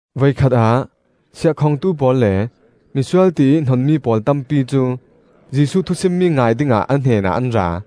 Voikhat ah siahkhongtu pawl le misual tiih hnonmi pawl tampi cu Jesuh thusimmi ngai dingah a hnenah an ra.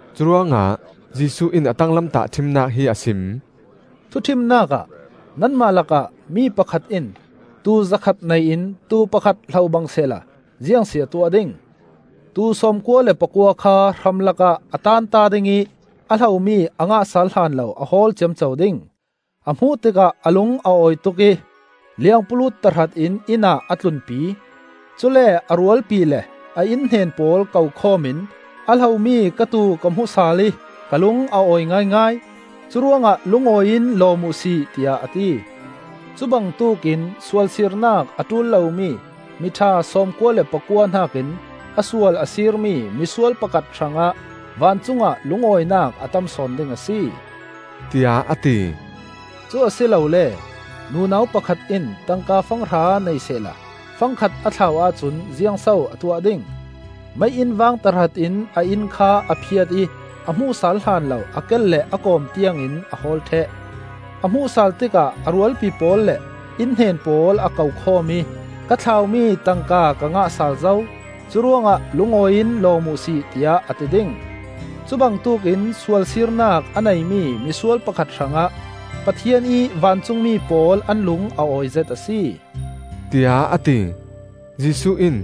Curuangah Jesuh in a tanglam tahṭhimnak hi a sim. “Thuṭhimnak ah nanmah lakah mi pakhat in tuu zakhat nei in tuu pakhat hlo bang sehla ziangsi a tuah ding? Tuu sawmkua le pakua kha hramlak ah a tanta ding ih a hlomi a ngah sal hlan lo a hawl ciamco ding. A hmuh tikah a lung a awi tuk ih liangpulut tahratin, inn ah a tlunpi. Cule a rualpi le a innhnen pawl ko khawm in ‘A hlomi ka tuu ka hmu sal ih ka lung a awi ngaingai. Curuangah lungawi in lawm uhsi,’ tiah a ti. Cubangtuk in sual sirnak a ṭul lomi miṭha sawmkua le pakua hnakin a sual a sirmi misual pakhat hrangah vancungah lungawinak a tamsawn ding a si,” tiah a ti. “Cu a si lole, nunau pakhat in tangka fang hra nei sehla fang khat a thlau ahcun ziangso a tuah ding? Mei-inn vang tahratin a inn kha a phiat ih a hmuh sal hlanlo a kel le a kawm tiangin a hawl ṭheh. A hmuh sal tikah a rualpi pawl le innhnen pawl a ko khawm ih ‘Ka thlaumi tangka ka ngah sal zo; curuangah lungawi in lawm uhsi,’ tiah a ti ding. Cubangtuk in sual sirnak a neimi misual pakhat hrangah Pathian ih vancungmi pawl an lung a awizet a si,” tiah a ti. Jesuh in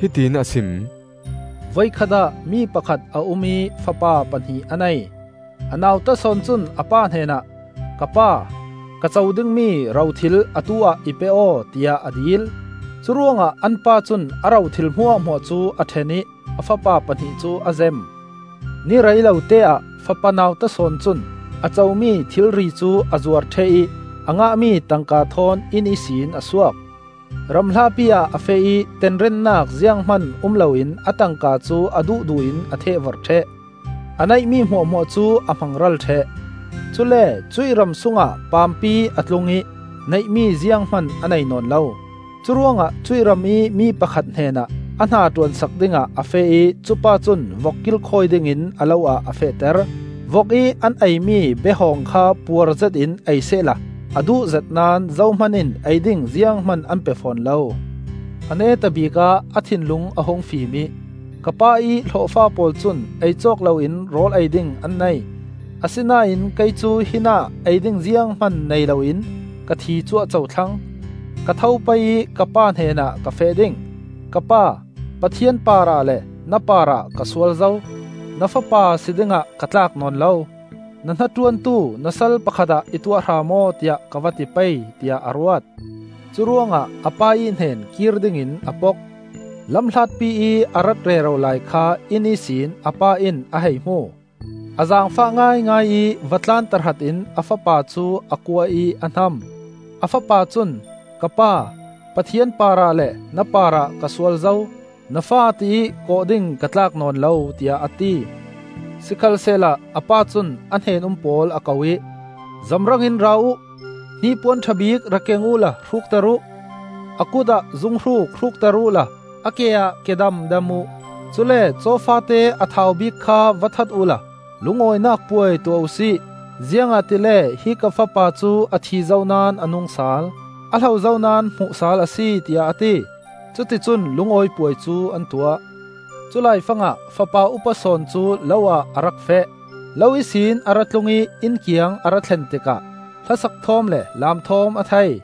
hiti in a sim. “Voikhat ah mi pakhat a um ih fapa pahnih a nei. A nauta sawn cun a pa hnenah, ‘Ka pa, ka co dingmi rothil atu-ah i pe aw,’ tiah a dil. Curuangah an pa cun a ro thil hmuahhmuah cu a ṭhen ih a fapa pahnih cu a zem. Ni rei loteah fapa nauta sawn cun a comi thilri cu a zuar ṭheh ih a ngahmi tangka thawn inn ihsin a suak. Ram hlapi ah a feh ih tenrennak zianghman um loin a tangka cu a duhduh in a thehvorh ṭheh. A neihmi hmuahhmuah cu a hmang ral ṭheh. Cule cuih ram sungah paampi a tlung ih neihmi zianghman a nei nawn lo. Curuangah cuih ramih mi pakhat hnenah a hna ṭuansak dingah a feh ih cupa cun vok kilkhawi dingin a lo ah a fehter. Vok ih an eimi be-hawng kha puar zetin ei sehla a duh zet naón zohman in ei ding zianghman an pe fawn lo. A neta bikah a thinlung a hung fim ih, ‘Ka pa ih hlawhfa pawl cun ei cawk loin rawl ei ding an nei; asinain kei cu hinah ei ding zianghman nei loin ka thi cuahco thlang! Ka tho pei ih ka pa hnenah ka feh ding. Ka pa, Pathian parah le na parah ka sual zo. Na fapa si dingah ka tlak nawn lo; na hnaṭuantu na sal pakhat ah i tuah hram aw, tiah ka va ti pei,’ tiah a ruat. Curuangah a pa ih hnen kir dingin a pok. “Lam hlatpi ih a rat rero lai kha inn ihsin a pa in a hei hmu. A zaangfah ngaingai ih va tlan tahratin a fapa cu a kuah ih a hnam. A fapa cun, ‘Ka pa, Pathian parah le na parah ka sual zo. Na fa tiih kawh ding ka tlak nawn lo,’ tiah a ti. Sikhalsehla a pa cun a hnen-um pawl a ko ih, ‘Zamrang in ra uh! Hnipuan ṭha bik rak keng uhla hrukter uh. A kutah zunghruk hrukter uhla a ke ah kedam dam uh. Cule caw faate a thau bik kha va that uhla lungawinak puai tuah uhsi! Ziangahtile hi ka fapa cu a thizo naón a nung sal; a hlozo naón hmuhsal a si,’ tiah a ti. Cuticun lungawi puai cu an tuah. “Cu laifangah fapa upa sawn cu lo ah a rak feh. Lo ihsin a ra tlung ih inn kiang a ra thlen tikah hlasak thawm le laam thawm a thei.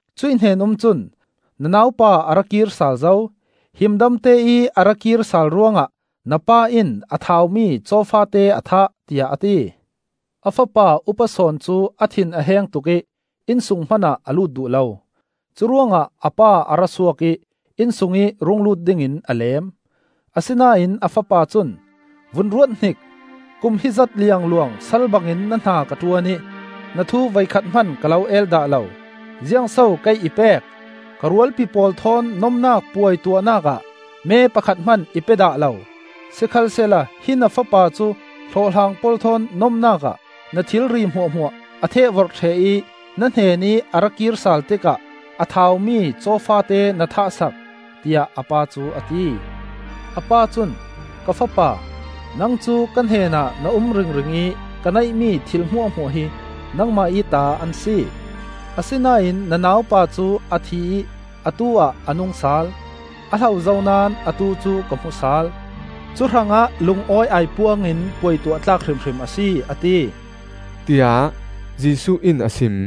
Cuih hnen-um cun, ‘Na naupa a ra kir sal zo, himdamte ih a ra kir sal ruangah na pa in a thaumi caw faate a thah,’ tiah a ti. “A fapa upa sawn cu a thin a heng tuk ih innsung hmanah a lut duh lo. Curuangah a pa a ra suak ih innsungih rung lut dingin a leem. Asinain a fapa cun, ‘Vun ruat hnik! Kum hizat liangluang sal bangin na hna ka ṭuan ih na thu voikhat hman ka lo el dah lo. Ziang so kei i pek? Ka rualpi pawl thawn nomnak puai tuahnak ah me pakhat hman i pe dah lo! Sikhalsehla hi na fapa cu hlawhhlang pawl thawn nomnak ah na thilri hmuahhmuah a thehvorh ṭheh ih na hnenih a ra kir sal tikah a thaumi caw faate na thah sak!’ tiah a pa cu a ti. A pa cun, ‘Ka fapa, nang cu ka hnenah na um ringring ih ka neihmi thil hmuahhmuah hi nangmah ih ta an si. Asinain na naupa cu a thi ih atu-ah a nung sal; a hlozo naón atu cu ka hmu sal; cuhrangah lungawi aipuang in puai tuah tlak hrimhrim a si,’ a ti,” tiah Jesuh in a sim.